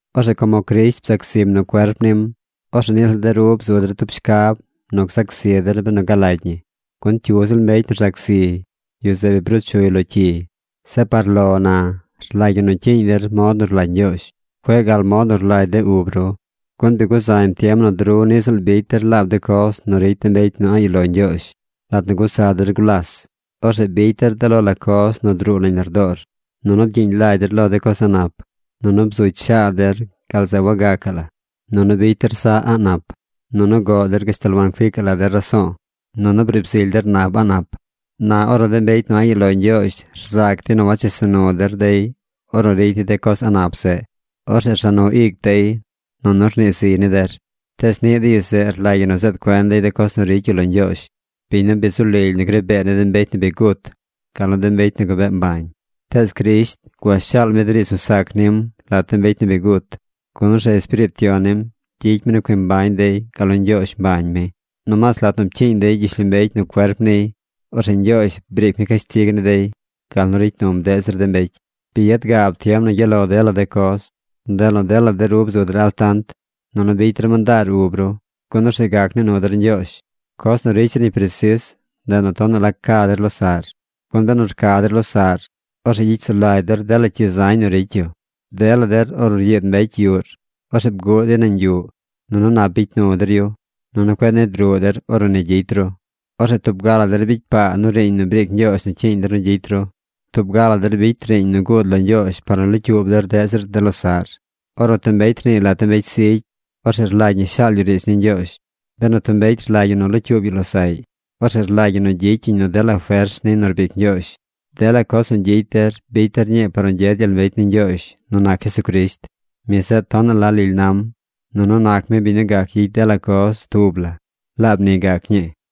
Orzeꞌ como Crisht bzac zim nu cuerp nim, orzeꞌ niꞌ ziꞌl de ru bzu der tub shcab nu gzac zi der benu galagy ñi, gun cyu ziꞌl mbecy nu rzac zi, yu zeꞌ bi bruu chuy lo cyi. Zeꞌ par lo na, rlagy ñi nu cyiiñ der mod nu rlagy Ñgyoozh. Cueꞌ gal mod nu rlagy de ub ru. Gun bi guzañ tiem nu de ru niꞌ ziꞌl bicy der laab de coz nu ricy de mbecy nu a̱ꞌ yuꞌ lo Ñgyoozh. Lat nu gusa der gulas, orzeꞌ bicy der de lo la coz nu druu nañ lardoor. Nunu bgyiiñ lagy der lo de coz a̱ꞌ nap. Nunu bzugy shaad der gal zeꞌ wagacaꞌ la. Nunu bicy der saꞌ a̱ꞌ nap. Nunu goꞌ der gashtal wancuicaꞌ la der raso̱o̱. Nunu briib zily der nab a̱ꞌ nap. Na ornu de mbecy nu a̱ꞌ yuꞌ lo Ñgyoozh rzac dey nu wachesa nu der dey ornu ricy dey de coz a̱ꞌ nap zeꞌ, orzeꞌ rza nu ic dey nunu rnii ziy ni der. Tees niꞌ de yu zeꞌ rlagy ñi nu zeed cuen dey de coz nu ricy yu lo Ñgyoozh, biñ nu bi zu lily nu gri bee ni de mbecy nu bi gut, gal nu de mbecy nu gabee mbañ. Tees Crisht gua shaal mi de riidz nu sac nim lat de mbecy nu bi gut, gun orzeꞌ Espiriit Yon nim gyicy mi nu cui mbañ dey gal nu Ñgyoozh mbañ mi. Nomaas lat nu pcyiiñ dey gyishlombecy nu cuerp niy, orzeꞌ Ñgyoozh briic mi cashtig ni dey gal nu ricy num deꞌ zir de mbecy. Bi yad gaab tiem nu gyaꞌ lo dela de coz. Ndeꞌ nu dela de ru bzu der altant, nunu bicy der mandaar ub ru, gun orzeꞌ gac nii nu der Ñgyoozh. Coz nu ricy zir ñi presis, ndeꞌ nu tonaꞌ la ca der losaꞌr, gun benu rca der losaꞌr, orzeꞌ gyicy sulagy der dela cyi zañ nu ricy yu. Dela der, ornu ryiid mbecy yuꞌr, orzeꞌ bguꞌ dey nañ yuꞌ, nunu nap bicy nu der yu. Nunu cueꞌ nid ruꞌ der ornu ni gyicy ru. Orzeꞌ tub ga la der bicy paa nu riiñ nu briic Ñgyoozh nu cyiiñ der nu gyicy ru. Tub ga la der bicy riiñ nu guud lo Ñgyoozh par nu locyuub der deꞌ zir de losaꞌr. Ornu tub mbecy rniiy lat de mbecy zigy, orzeꞌ rlagy ñi shaal yu riidz ni Ñgyoozh. Benu tub mbecy rlagy yu nu locyuub yu losaꞌy, orzeꞌ rlagy ñi nu gyicy yuñ nu dela fers niy nu rbic Ñgyoozh. Dela coz nu gyicy der bicy der ñii par nu gyed gyel mbecy ni Ñgyoozh nu nac Jesucrisht. Mi zeꞌ tonaꞌ la lily nam, nunu nac mi biñ nu gac gyicy dela coz tub la. ¡Laab ni gac ñii!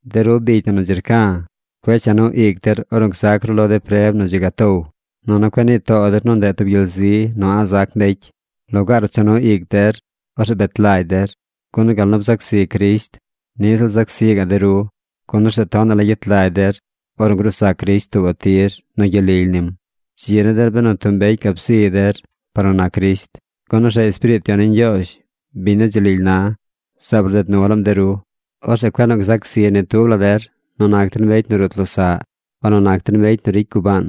De ru bicy na nu dzi rca̱, cueꞌ cha nu ic der ornu gzac ru lo de preb nu dzi gatow. Nunu cueꞌ nii too der nu ndeꞌ tub gyel zi nu a̱ꞌ zac mbecy. Lugaar nu cha nu ic der, orzeꞌ bet lagy der, gun gal nu bzac zi Crisht, niꞌ ziꞌl zac zi gaꞌ de ru, gun orzeꞌ tonaꞌ la gyet lagy der ornu gruu zac Crisht tuubaꞌ tir nu gyel lily nim. Dzi ni der benu tub mbecy gab ziy der par nu nac Crisht. Gun orzeꞌ Espiriit Yon ni Ñgyoozh, biñ nu dzi lily na, zaab rded nu laam de ru. Orzeꞌ cueꞌ nu gzac zi ni tub la der nu nac der mbecy nu rut losaꞌ, o nu nac der mbecy nu ricy gubaan,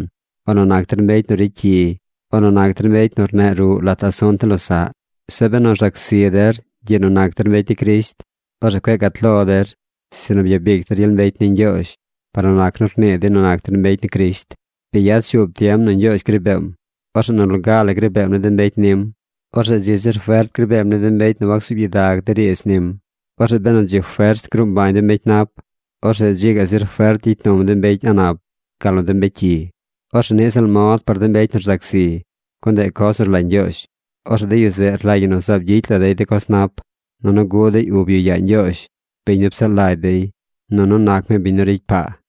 o nu nac der mbecy nu ricy cyi, o nu nac der mbecy nu rneꞌ ruꞌ lat asunt ni losaꞌ. Zeꞌ benu rzac zi der gyiꞌ nu nac der mbecy ni Crisht, orzeꞌ cueꞌ gat lo der, sinu byabic der gyel mbecy ni Ñgyoozh par nu rnii dey nu nac der mbecy ni Crisht. Bi yad shuub tiem nu Ñgyoozh gri beem. Orzeꞌ nu loga la gri beem ni de mbecy nim. Orzeꞌ dzi zir fert gri beem ni de mbecy nu wansuub gyidag de riidz nim. Orzeꞌ benu dzi fers gruu mbañ de mbecy nap, orzeꞌ dzi gaꞌ zir fert gyicy num de mbecy a̱ꞌ nap gal nu de mbecy cyi. Orzeꞌ niꞌ ziꞌl mod par de mbecy nu rzac zi, gun ndeꞌ coz nu rlagy Ñgyoozh. Orzeꞌ de yu zeꞌ rlagy ñi nu zaab gyicy la dey de coz nap. Nunu guꞌ dey ub yu yaa Ñgyoozh, biñ nu psaꞌ lagy dey. Nunu nac mi biñ nu ricy paa.